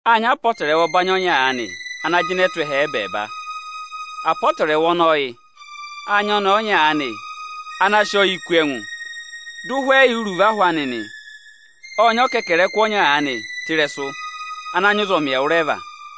Â nyị apọtẹrẹwa ọbanyị ọnya ana jịnẹ tụ́ ẹhẹ ẹ́bẹẹba; apọtẹrẹwa ọnọọ yị: Â nyị ọnẹẹ ọnya aanị ana sị ọyị mẹ ịta kú ẹngụ, dị ụhwẹ yà iruvo ahụ anị nị. Ô kú ọkẹkẹrẹkụ ọnya ana nyị ụzọmị ẹwụrẹva.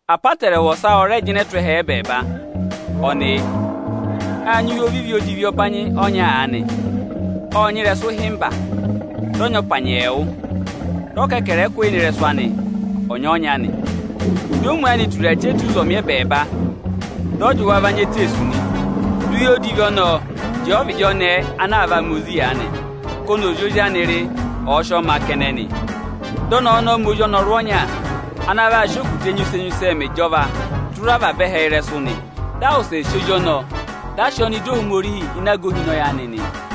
Apọtẹrẹwa ọsa ọ rẹ jịnẹ tụ́ ẹhẹ ẹ́bẹẹba: Â nyị uye odivi ọnya aanị. Ọ́ nyị ịrẹsụ ịhịmba, dị ọ nyị ọpanyị ẹẹwụ, dị ọkẹkẹrẹkụ yà ịnị ịrẹsụ anị ọnya-ọnya nị. Omu anị ô tura achẹta ụzọmị ẹbẹẹba, dị ọ jị wa va nya eteesu nị. Di uye odivi ọnọọ jẹẹ ọvịdị ọnẹẹ ana aa vaa ma ozi aanị, ka ọnị ọ̀ za ozi anị rị, ọ̀ọ ma a kẹnẹ nị. Dị ọnẹẹ ọnọọ ma ozi ọnọrụ ọnya, ana vaa sị okutẹ enyusẹ-enyusẹ mẹ ịjọvaa tụra avaba ẹhẹ ịrẹsụ nị. Dị a wụsẹ sị ozi ọnọọ, dị a sị ọọ nọ ịdị Ohomorihi ịzị aga ohinọyị anị yà nị.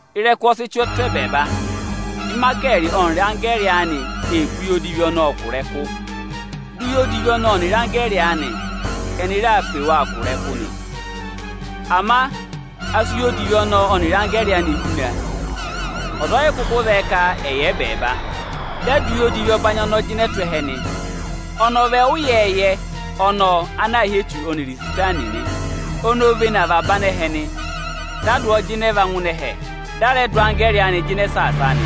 Ịrẹkụ ọ sị chị tụ́ ẹbẹẹba. Ịmayịkẹẹrị ọnịrị anggẹẹrị anị ee pe uye odivi ọnọọ kụ̀ ịrẹkụ. Di uye odivi ọnọọ ọnịrị anggẹẹrị anị ẹnị ree pe wa kụ̀ ịrẹkụ nị. Ama a sị uye odivi ọnọọ ọnịrị anggẹẹrị anị huna, ọza ọ yị kụkụ zẹẹ ka ẹ̀ yà ẹbẹẹba. Dị a dụ uye odivi ọbanyị ọnọọ jịnẹ tụ́ ẹhẹ nị. Ọnị ọ vị ẹwụ ịyẹẹyẹ ọnọọ ana aā hị́ Echu ọnịrị Isitani nị. Oni o vene avaba anẹhẹ nị. Dị a dụ ọọ jịnẹ va ngụ ẹhẹ, dị a rẹ dụ anggẹẹrị anị jịnẹ saasa a nị.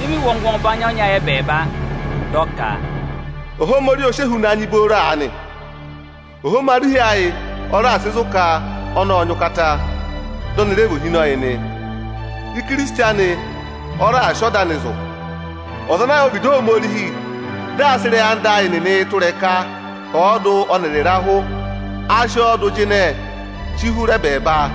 Dị mị wụ́ ọngwẹ ọbanyị ọnya ẹbẹẹba, dị aa kà a ka: Ohomorihi o si ehuna nyị booro aanị! Ohomorihi ayị ọ raà sị zụ̀ ka ọnị ọ nyị ụkata, dị ọnị rẹ vị ohinọyị nị. Ohinọyị anị ọnị ọ nyị ka ọ̀ dọ yị há ọ raà sị ọda anị zụ̀. Ọza ana yà ọvịdị Ohomorihi dị aa sị ịrẹyị anda ayị nịnị ị tụ́ ịrẹka ọọdụ ọnịrị ịrahụ, a sị ọọ dụ jịnẹ hụrị ẹbẹẹba.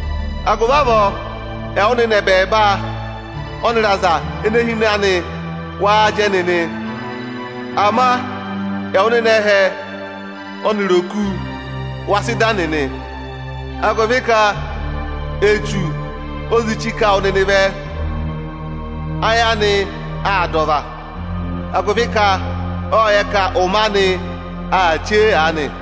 Agụvị avọọ, ẹwụ nịnị ẹbẹẹba ọnịrị aza ene hi ịnị anị, waa jẹ nịnị! Ama ẹwụ nịnị ẹhẹ ọnịrị oku, wa sị da nịnị, agụvị ka Echu o zi chí ka wụ nịnị vẹ. Ayị anị aa dà ọva, agụvị ka ộ yẹ ka ụmẹ anị aa chee aanị.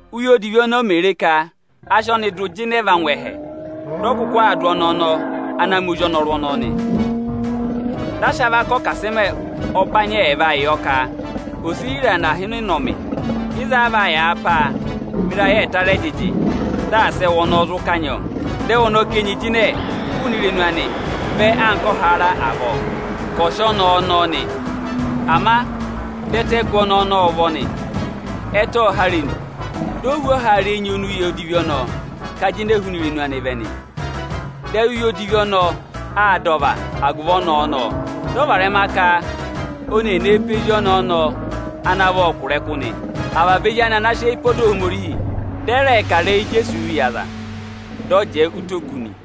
Úye odivi ọnọọ mè re ka a sị ọnị dụ va ngụ ẹhẹ, dị ọ kụkụ aa dụ ọnẹẹ ọnọọ ana ma ozi ọnọrụ ọnọọ nị. Dị a sị avaka ọkasịmẹ ọbanyị ẹẹva yọ ka ò si hira nọ aha anị ịnị ụnọmị nị. Ịzọọ a vaa yàa pá a mẹ ịrayị ẹẹta rị ẹjịjị, dị asị ẹwụ ọnọọ zụ kanyị ọọ nị. Dị ẹwụ ọnọọ ká enyi jịnẹ hụụnị irenu anị anka ọhaara avọọ ka ọ̀ sị ọnẹẹ ọnọnị nị. Ama dị ẹtẹ gụ ọnẹẹ ọnọọ ụvọ nị; ẹtẹ ộ há irenu, di o hú ọhaara enyi ọnị uye odivi ọnọọ ká jịnẹ hụụnị irenu anị vẹ nị. Dị ayị uye odivi ọnọọ aa dà ọva agụvị ọnẹẹ ọnọọ, dị ọ varẹma ka oni ee nee pe ezi ọnẹẹ ọnọọ kụ̀ ịrẹkụ nị, avaba ezi anị anaa saasa ọda Ohomorihi, dị ẹ rẹ sị ụvọ za ịrẹyị ịzẹyịza oni Ijeesu sị zụ wa. Dị ọ na jẹẹ ụtọ oku nị.